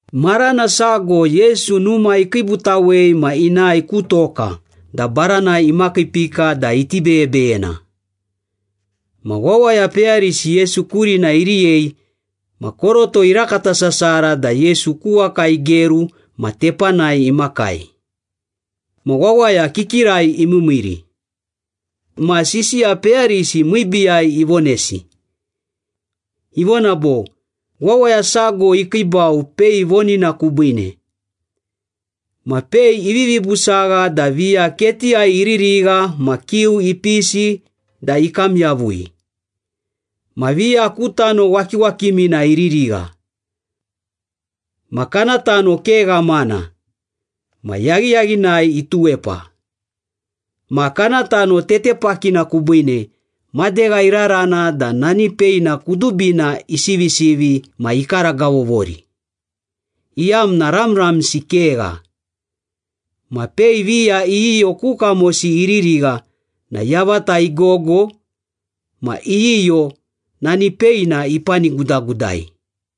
Marana sago Yesu numa ikiibutawei ma inae ku toka da baranai imakiipika da iti beyebeyena. Ma wawaya peyarisi Yesu kurina iriyei ma koroto irakata sasara da Yesu ku waka igeru ma tepanai imakai. Ma wawaya kikirai imiimiiri. Ma sisiya peyarisi miibiiyai ivonesi. Ivona bo, “Wawaya sago ikiibau pei vonina kubiine. Ma pei ivivi busagha da viya ketiyai iririgha ma kiu ipisi da ikam yavui. Ma viya ku tano wakiwakimina iririgha, ma kana tano ke ghamana. Ma yaghiyaghinai ituwepa. Ma kana tano tetepakina kubiine, madegha irarana da nani peina kudubina isivisivi ma ikaragavovori, iyamna ramramsi kegha. Ma pei viya iyiyo ku kamosi iririgha na yavata igogo ma iyiyo nani peina ipanigudagudai.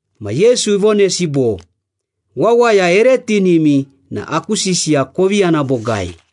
Ma Yesu ivonesi bo, “Wawaya ere tinimi na aku sisiya kovi yana bogai.”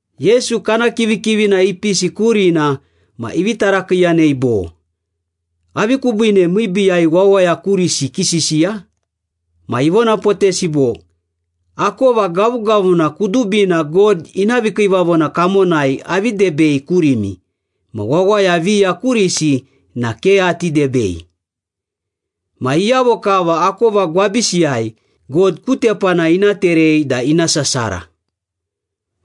Yesu kana kivikivina ipisi kurina ma ivi tarakiiyanei bo, “Avi kubiine miibiiyai wawaya kurisi kisisiya?” Ma ivonapotesi bo, “Akova gavugavuna kudubina God ina vikiivavona kamonai avi debei kurimi, ma wawaya viya kurisi na ke ati debei. Ma iyavo kava akova gwabisiyai, God ku tepana ina terei da ina sasara.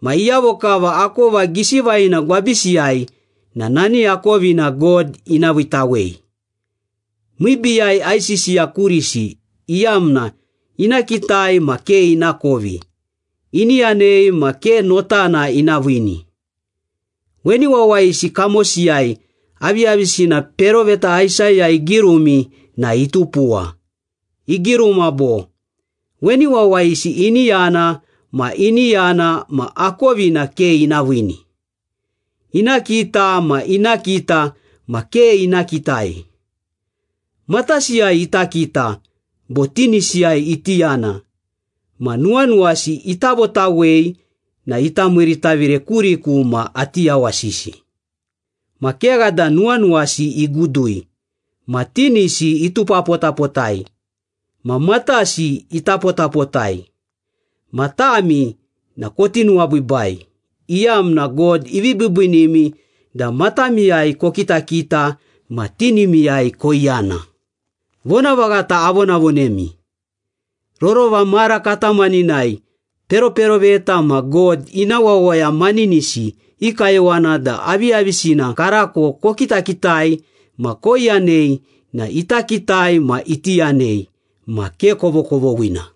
Ma iyavo kava akova gisi vaghina gwabisiyai na nani akovina God ina viitawei. Miibiiyai aisisiya kurisi, iyamna ina kitai ma ke inakovi, ini yanei ma ke notana ina viini. Weni wawayisi kamosiyai aviyavisina peroveta Aisaya igirumi na itupuwa. Igiruma bo, ‘Weni wawayisi ini yana ma ini yana ma akovina ke ina viini. Ina kita ma ina kita ma ke ina kitai. Matasiyai ita kita, bo tinisiyai iti yana, ma nuwanuwasi ita votawei, na ita miiritavire kuriku ma ati yawasisi. Ma kegha da nuwanuwasi igudui, ma tinisi itupapotapotai, ma matasi itapotapotai.’” “Ma tami na koti nuwabiibai, iyamna God ivi biibiinimi da matamiyai kokitakita ma tinimiyai koiyana. Vonavaghata avonavonemi, rorova mara katamaninai peroperoveta ma God ina wawaya maninisi i kayowana da aviyavisina karako kokitakitai ma koiyanei na ita kitai ma iti yanei, ma ke kovokovoghina.”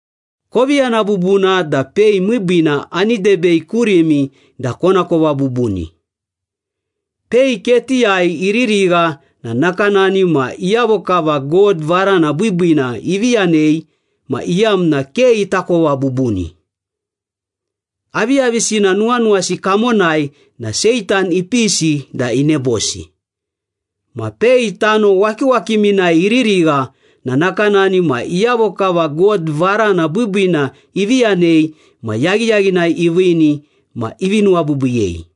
“Kovi yana bubuna da pei miibiina ani debei kurimi da konakova bubuni. Pei ketiyai iririgha na nakanani ma iyavo kava God varana biibiina ivi yanei ma iyamna ke itakova bubuni. Aviyavisina nuwanuwasi kamonai na Seitan ipisi da inebosi. Ma pei tano wakiwakiminai iririgha na nakanani ma iyavo kava God varana biibiina ivi yanei ma yaghiyaghinai iviini ma ivi nuwabiibiiyei.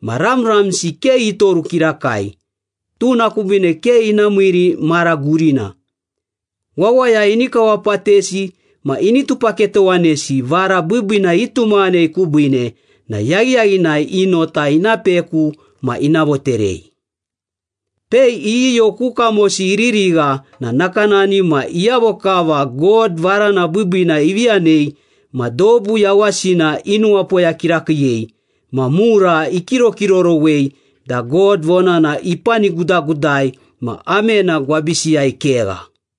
Ma ramramsi ke itoru kirakai, tuna kubiine ke ina miiri mara gurina. Wawaya ini kawapatesi ma ini tupaketowanesi vara biibiina itumaghanei kubiine na yaghiyaghinai i nota ina peku ma ina voterei. Pei iyiyo ku kamosi iririgha na nakanani ma iyavo kava God varana biibiina ivi yanei ma dobu yawasina inuwapoya kirakiiyei ma mura ikirokirorowei da God vonana ipanigudagudai ma amena gwabisiyai kegha.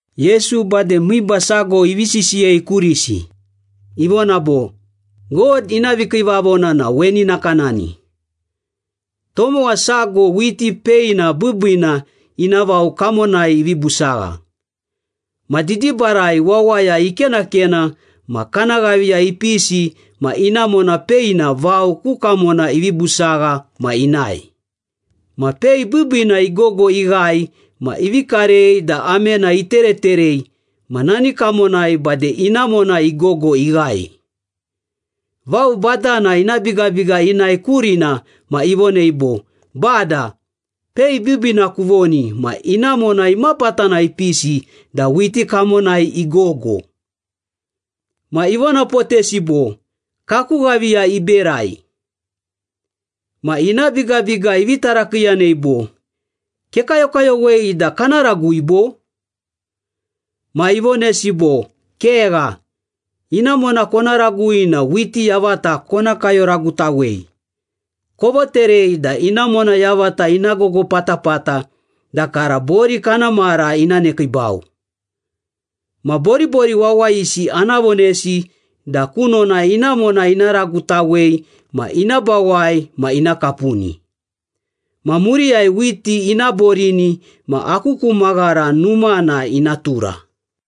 Yesu bade miiba sago ivi sisiyei kurisi. Ivona bo, “God ina vikiivavona na weni nakanani. Tomowa sago whiti peina biibiina ina vao kamonai ivi busagha. Ma didibarai wawaya ikenakena ma kana ghaviya ipisi ma inamona peina vao ku kamona ivi busagha ma inae. Ma pei biibiina igogo ighae ma ivi karei da amena itereterei ma nani kamonai bade inamona igogo ighae.” “Vao badana ina bigabiga inae kurina ma ivonei bo, ‘Bada, pei biibiina kuvoni ma inamona imapatana ipisi da whiti kamonai igogo?’” “Ma ivonapotesi bo, ‘Kaku ghaviya iberai.’” “Ma ina bigabiga ivi tarakiiyanei bo, ‘Kekayokayowei da kana ragui bo?’” “Ma ivonesi bo, ‘Kegha. Inamona kona ragui na whiti yavata kona kayoragutawei. Kovoterei da inamona yavata ina gogo patapata da kara bori kana mara ina nekiibau. Ma boribori wawayisi ana vonesi da kunona inamona ina ragutawei ma ina bawai ma ina kapuni. Ma muriyai whiti ina borini ma aku ku maghara numana ina tura.’”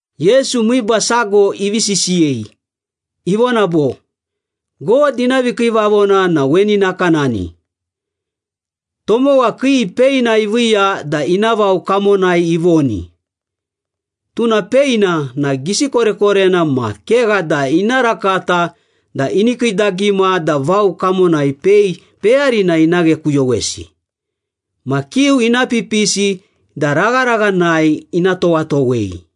Yesu miiba sago ivi sisiyei. Ivona bo, “God ina vikiivavona na weni nakanani. Tomowa kii peina iviiya da ina vao kamonai ivoni. Tuna peina na gisi korekorena ma kegha da ina rakata da ini kiidagima da vao kamonai pei peyarina ina ghekuyowesi. Ma kiu ina pipisi da ragharaghanai ina towatowei.”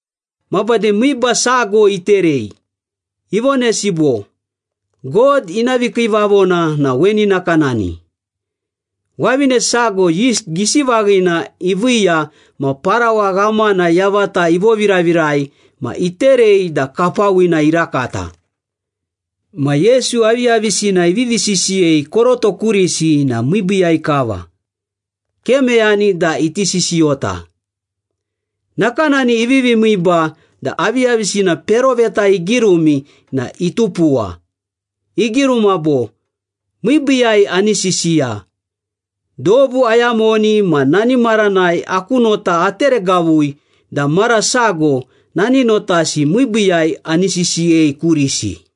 Ma bade miiba sago iterei. Ivonesi bo, “God ina vikiivavona na weni nakanani. Wavine sago yist gisi vaghina iviiya ma parawa ghamana yavata ivoviravirai ma iterei da kapawina irakata.” Ma Yesu aviyavisina ivivi sisiyei koroto kurisi na miibiiyai kava, ke meyani da iti sisiyota. Nakanani ivivi miiba da aviyavisina peroveta igirumi na itupuwa. Igiruma bo, “Miibiiyai ani sisiya, Dobu ayamoni ma nani maranai aku nota ateregavui da mara sago nani notasi miibiiyai ani sisiyei kurisi.”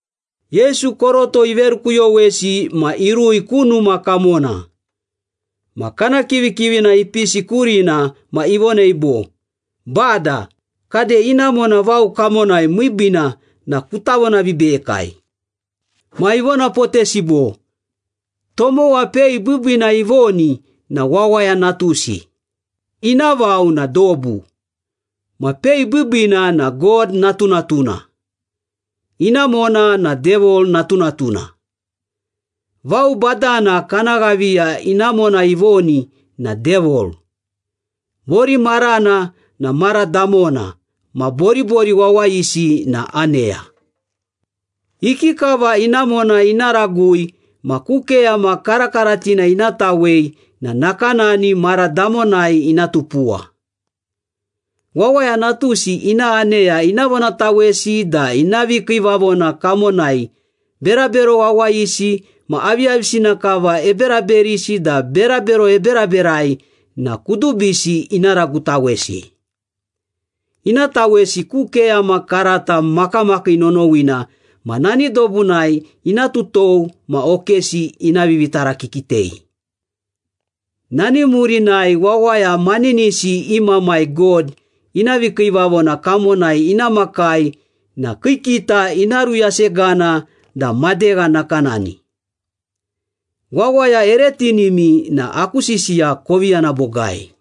Yesu koroto iverukuyowesi ma irui ku numa kamona. Ma kana kivikivina ipisi kurina ma ivonei bo, “Bada, kade inamona vao kamonai miibiina na kuta vonavibeyekai.” Ma ivonapotesi bo, “Tomowa pei biibiina ivoni na Wawaya Natusi. Ina vao na dobu. Ma pei biibiina na God natunatuna. Inamona na Devil natunatuna. Vao badana kana ghaviya inamona ivoni na Devil. Bori marana na mara damona ma boribori wawayisi na aneya.” “Ikikava inamona ina ragui ma ku keyama karakaratina ina tawei na nakanani mara damonai ina tupuwa. Wawaya Natusi ina aneya ina vonatawesi da ina vikiivavona kamonai berabero wawayisi ma aviyavisina kava eberaberisi da berabero eberaberai na kudubisi ina ragutawesi. Ina tawesi ku keyama karata makamakii nonowina ma nani dobunai ina tutou ma okesi ina vivitarakikitei. Nani murinai wawaya maninisi i Mamai God ina vikiivavona kamonai ina makai na kii kita ina ruyasegana da madegha nakanani. Wawaya ere tinimi na aku sisiya kovi yana bogai.”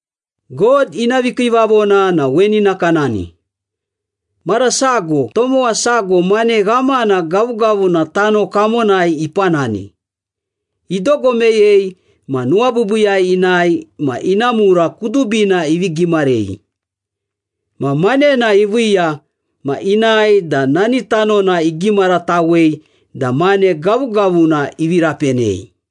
“God ina vikiivavona na weni nakanani. Mara sago tomowa sago mane ghamana gavugavuna tano kamonai ipanani. Idogo meyei ma nuwabiibiiyai inae ma ina mura kudubina ivi gimarei. Ma manena iviiya ma inae da nani tanona igimaratawei da mane gavugavuna ivi rapenei.”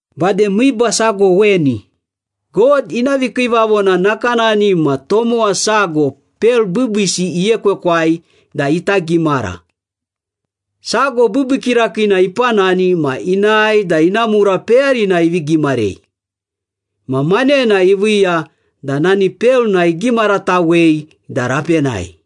“Bade miiba sago weni. God ina vikiivavona nakanani ma tomowa sago pel biibiisi iekwekwai da ita gimara. Sago biibii kirakiina ipanani ma inae da ina mura peyarina ivi gimarei. Ma manena iviiya da nani pelna igimaratawei da rapenai.”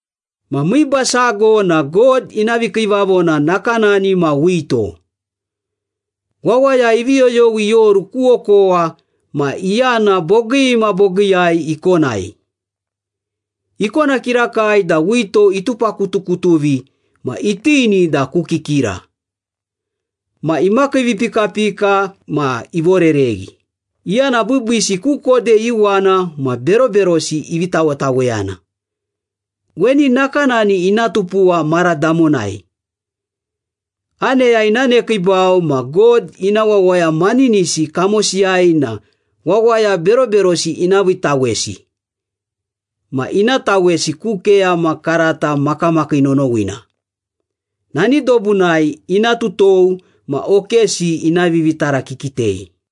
“Ma miiba sago na God ina vikiivavona nakanani ma wito. Wawaya ivi yoyowi ioru ku okowa ma iyana bogii ma bogiiyai ikonai. Ikona kirakai da wito itupakutukutuvi ma itini da ku kikira. Ma imakiivipikapika ma ivorereghi, iyana biibiisi ku kode iuwana ma beroberosi ivi tawetaweyana. Weni nakanani ina tupuwa mara damonai. Aneya ina nekiibau ma God ina wawaya maninisi kamosiyai na wawaya beroberosi ina viitawesi ma ina tawesi ku keyama karata makamakii nonowina. Nani dobunai ina tutou ma okesi ina vivitarakikitei.”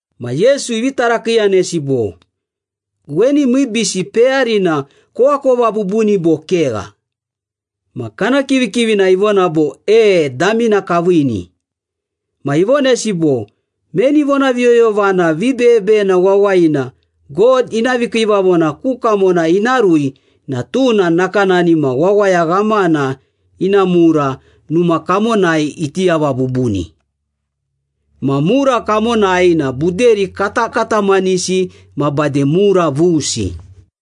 Ma Yesu ivi tarakiiyanesi bo, “Weni miibiisi peyarina koakova bubuni bo kegha?” Ma kana kivikivini ivona bo, “E, damina kaviini.” Ma ivonesi bo, “Meni vonaviyoyovana vibeyebeyena wawayina God ina vikiivavona ku kamona ina rui na tuna nakanani ma wawaya ghamana ina mura numa kamonai iti yava bubuni. Ma mura kamonai na buderi katakatamanisi ma bade mura vusi.”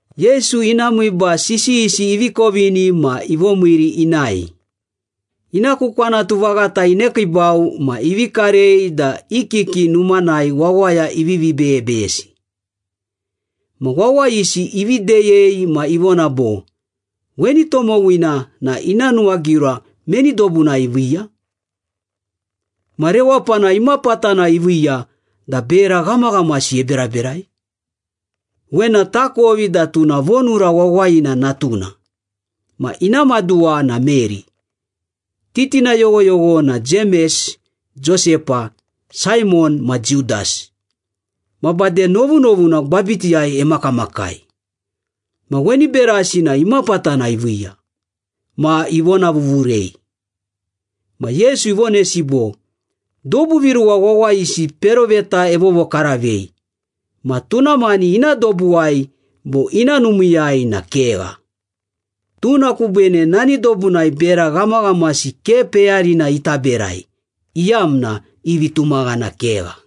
Yesu ina miiba sisiyisi ivi kovini ma ivomiiri inae. Ina ku kwanatu vaghata inekiibau ma ivi karei da i kiki numanai wawaya ivivi beyebeyesi. Ma wawayisi ivi deyei ma ivona bo, “Weni tomowina na ina nuwagiura meni dobunai iviiya? Ma rewapana imapatana iviiya da bera ghamaghamasi eberaberai? Wena takovi, da tuna vonura wawayina natuna, ma ina maduwa na Meri. Titina yoghoyogho na Jemes, Josepa, Saimon ma Judas. Ma bade novunovuna gwabitiyai emakamakai. Ma weni berasi na imapatana iviiya?” Ma ivonavuvurei. Ma Yesu ivonesi bo, “Dobu viruwa wawayisi peroveta evovokaravei, ma tuna mani ina dobuwai bo ina numiiyai na kegha.” Tuna kubiine nani dobunai bera ghamaghamasi ke peyarina ita berai, iyamna i vitumaghana kegha.